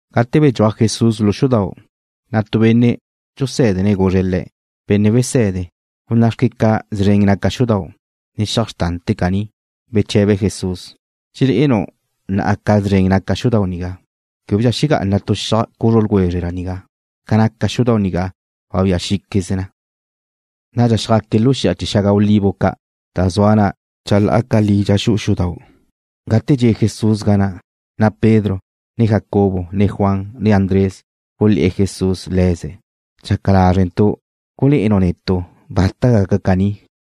Gate bedxúaj Jesús lu xudau', na' tu benne' dxusé̱dene̱' guzre̱' Le̱': ―Benne' Wese̱de, gunná'xque ca zren naca xudau', ne xiaj xrtante̱ caní. Beche̱be Jesús: ―¿Dxelé'enu' na'a ca zren naca xudau' nigá? Québedxa xegá'ana tu xiaj cuzru ljwezre nigá. Ca naca xudau' nigá wabía xí'queze na. Nadxa xjaque̱' lu xi'a chee̱ xaga olivo ca', da zua na chalá'a ca li dxa xu'u xudau'. Gate dxe' Jesús ga na', na' Pedro, ne Jacobo, ne Juan, ne Andrés gulé̱'e̱ Jesús le̱ze̱': ―Dxaca lázrentu' gulé'enu' netu' bata gaca caní.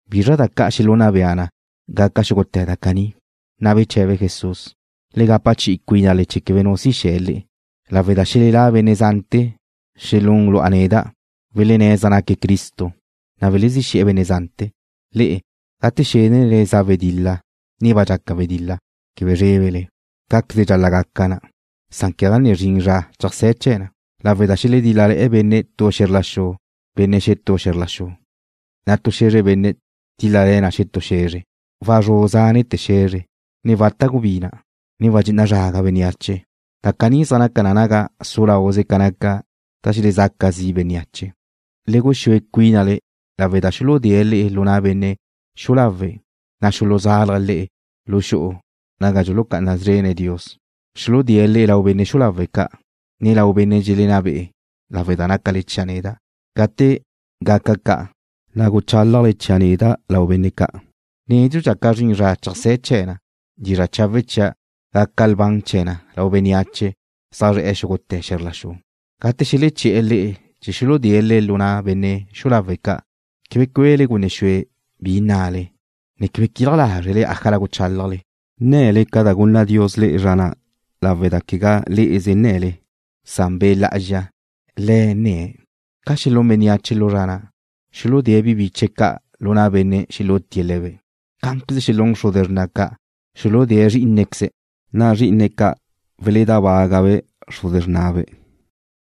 ¿Bizra da ca' xelunna bea na gaca xúgute̱ da caní? Na' beche̱be Jesús: ―Le gapa chi'i cuínale chee̱ quebe nu si xe̱ le'e, lawe' da xelelá' benne' zante̱ xelún lu'a neda', welenné̱' zaj naque̱' Cristo, na' welezí xe̱'e̱ benne' zante̱. ’Le'e, gate xénele gaca wedil-la, ne ba dxaca wedil-la, quebe zrébele. Cá'queze dxal-la' gaca na, san quegá ne zrin zra cheajsé̱ chee̱ na, lawe' da xeledíl-lale̱ benne' tu xe̱zr la xu benne' xetú xe̱zr la xu, na' tu xe̱zre benne' tíl-lale̱ na xetú xe̱zre. Wazrú' zánete̱ xe̱zre, ne wata' gubina', ne wadxé'e na zraga bénneache. Da caní zaj naca na naga su lauze ca naca da xelezaca zi' bénneache. ’Le guxúe cuínale lawe' da xuludée̱' le'e lu na' benne' xu'u lawe', na' xuluzalje̱' le'e lu xu'u naga dxulucá'ana szrene̱' Dios. Xuludée̱' le'e lau benne' xu'u lawe' ca', ne lau benne' dxelenná be'e̱ lawe' da nácale chia' neda'. Gate ca'an gaca, na' guchálajle chia' neda' lau benne' ca'. Nédxudxa ca zrin zra cheajsé̱ chee̱ na, dizra' chawe' chia' gaca lban chee̱ na lau bénneache zaj zre̱'e xúgute̱ xe̱zr la xu. Gate xeleché̱'e̱ le'e chee̱ xuludée̱' le'e lu na' benne' xu'u lawe' ca', quebe cue'le gunne xue bi nnale, ne quebe quilaj lázrele ájala guchálajle. Nne̱le ca da gunna Dios le'e zra na' lawe' da quegá le'eze nne̱le, san Be' Lá'azxa, Le̱' nne̱'. Ca xelún bénneache lu zra na', xuludée̱' bi biche̱' ca' lu na' benne' xelútie̱' le̱be'. Cá'anqueze xelún xruze xrna' ca', xuludée̱' zrí'inequeze̱'. Na' zrí'ine̱' ca' weledábagabe' xruze xrnabe',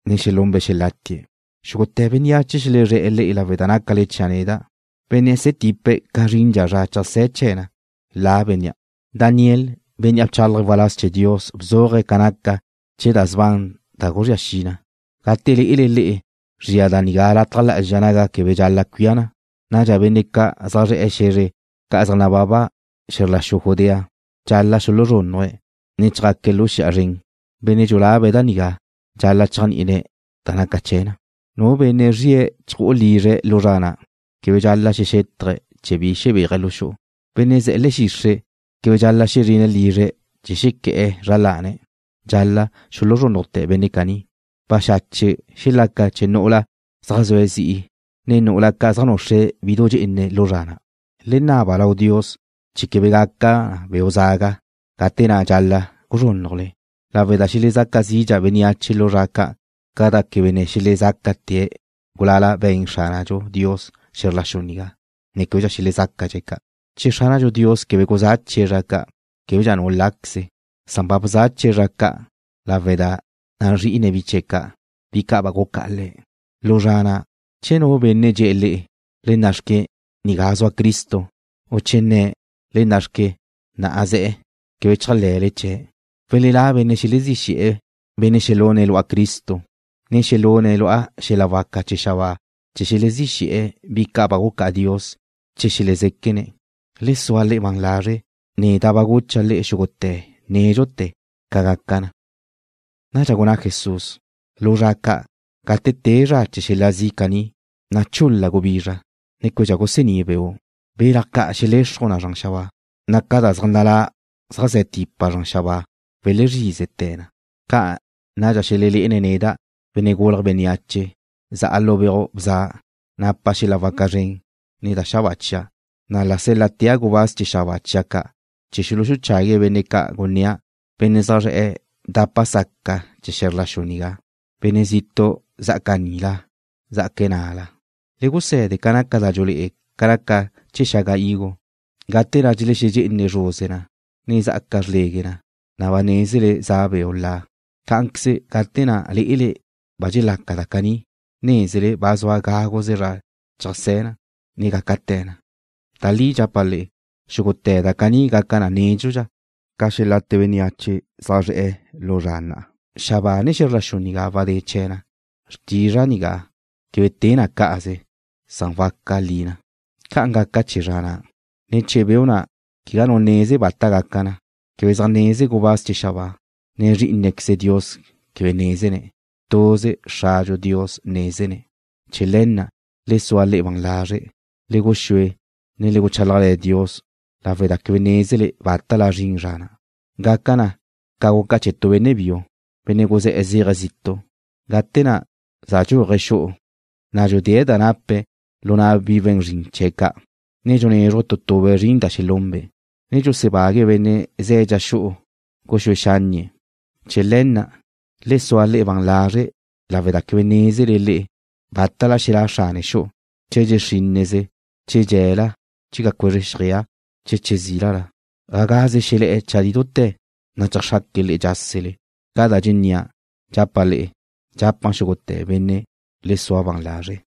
ne xelunbe' xelátie̱'. Xúgute̱ bénneache xelezré̱'e̱ le'e lawe' da nácale chia' neda'. Bénnea' ze̱ tipe̱' ca zrindxa zra cheajsé̱ chee̱ na, la bénnea'. ’Daniel, bénnea' bchálaje̱' waláz chee̱ Dios bzuaje̱' ca naca chee̱ da sban da guzría xi na. Gate lé'ele le'e zria da nigá lataj lá'azxa naga quebe dxal-la' cuía na, nadxa benne' zaj zre̱'e̱ xe̱zre ca' zaj nababa xe̱zr la xu Judea dxal-la' xuluzrúnnuje̱', ne chjaque̱' lu xi'a zren. (Benne' dxulabe̱' da nigá dxal-la' cheajní'ine̱' da naca chee̱ na.) Nu benne' zria chju'u lizre̱' lu zra na' quebe dxal-la' xexétaje̱' chee̱ bi xebéaje̱' lu xu'u. Benne' ze̱ le̱'e̱ xixre' quebe dxal-la' xezrine̱' lizre̱' chee̱ xequé̱'e̱ zra lane̱'. Dxal-la' xuluzrúnnujte̱ benne' caní. Baxache' xelaca nu'ula zaj zue̱' zi'i, ne nu'ula ca' zaj nuxre̱' bidu dxe'ene lu zra na'. Le naba lau Dios chee̱ quebe gaca beu' zaga gate na' dxal-la' guzrúnnujle, lawe' da xelezaca zidxa bénneache lu zra ca'an ca da quebe ne xelezácate̱', gulala be̱n Xránadxu Dios xe̱zr la xu nigá, ne québedxa xelezácadxe̱' ca'. Che Xránadxu Dios quebe guzáchie̱' zra ca', québedxa nu láqueze̱', san ba bzachie̱' zra ca'an lawe' da nazrí'ine̱' bi chee̱' ca', bi ca' ba gucá'a Le̱'. ’Lu zra na', che nu benne' dxe̱'e̱ le'e: “Le na' xque, nigá zua Cristo”, u che nne̱': “Le na' xque, na' ze̱'”, quebe chéajle̱le chee̱'. Welelá' benne' xelezí xe̱'e̱, benne' xelune̱' lu'a Cristo, ne xelune̱' lu'a xel-la waca chee̱ xabáa chee̱ xelezí xe̱'e̱ bi ca' ba gucá'a Dios che xelezéquene̱'. Le sua le'e ban lazre'. Neda' ba gucha' le'e xúgute̱ nédxute̱ ca gaca na. Nadxa gunná Jesús: ―Lu zra ca', gate te zra chee̱ xel-la zi' caní, na' chul-la gubizra, ne québedxa gusení' beu'. Belaj ca' xelexruj na zran xabáa, na' ca da zaj nalá' zaj ze̱ tipa zran xabáa welezrízete̱ na. Ca nadxa xelelé'ene̱' neda', Benne' Gulje̱' Bénneache, za'a lu beuj bza, napa' xel-la waca zren, ne da xabáa chia'. Na' la sél-latea' gubáz chee̱ xabáa chia' ca' chee̱ xuluchague̱' benne' ca' gunnía', benne' zaj zre̱'e̱ dapa saca chee̱ xe̱zr la xu nigá, benne' zitu' zá'aca nila, zá'aca na'la. ’Le guse̱de ca naca da dxulé'e na ca naca chee̱ xaga higo. Gate na' dxelexedxé'ene zruze na, ne zá'aca xrlegue na, na' ba nézele za beu' la. Cá'anqueze, gate na' lé'ele ba dxelaca da caní, nézele ba zua gáguze zra cheajsé̱ na, ne gácate̱ na. Da li dxapa' le'e, xúgute̱ da caní gaca na nédxudxa ca xelate bénneache zaj zre̱'e̱ lu zra na'. Xabáa ne xe̱zr la xu nigá wadé chee̱ na. Xrtizra' nigá quebe te na ca'anze, san waca li na. ’Ca naca chee̱ zra na', ne chee̱ beu' na' quegá nu neze bata gaca na. Quebe zaj neze gubáz chee̱ xabáa, ne Zrí'inequeze Dios quebe nézene̱'. Tuze Xradxu Dios nézene̱'. ’Chee̱ le̱ na', le sua le'e ban lazre'. Le guxúe, ne le guchálajle̱ Dios lawe' da quebe nézele bátala zrin zra na'. Gaca na ca guca chee̱ tu benne' biu, benne' guzé̱'e̱ zéaje̱' zitu'. Gate na' za dxúaje̱' xu'u, na' dxudée̱' da nape̱' lu na' bi we̱n zrin chee̱' ca', ne dxunézruje̱' tu tube' zrin da xelunbe', ne dxusebague̱' benne' ze̱' dxa xu'u guxúe xánnie̱'. Chee̱ le̱ na', le sua le'e ban lazre' lawe' da quebe nézele le'e bátala xelá' xrane xu'u, che dxe xrínneze, che dxe̱la, che ca cuezre xjeaj, che che zílala, ga gaze xelé̱'e̱ chadí dute̱, na' cheajxraque̱' le'e dxásele. Ca da dxennía', dxapa' le'e, dxapa' xúgute̱ benne': ¡Le sua ban lazre'!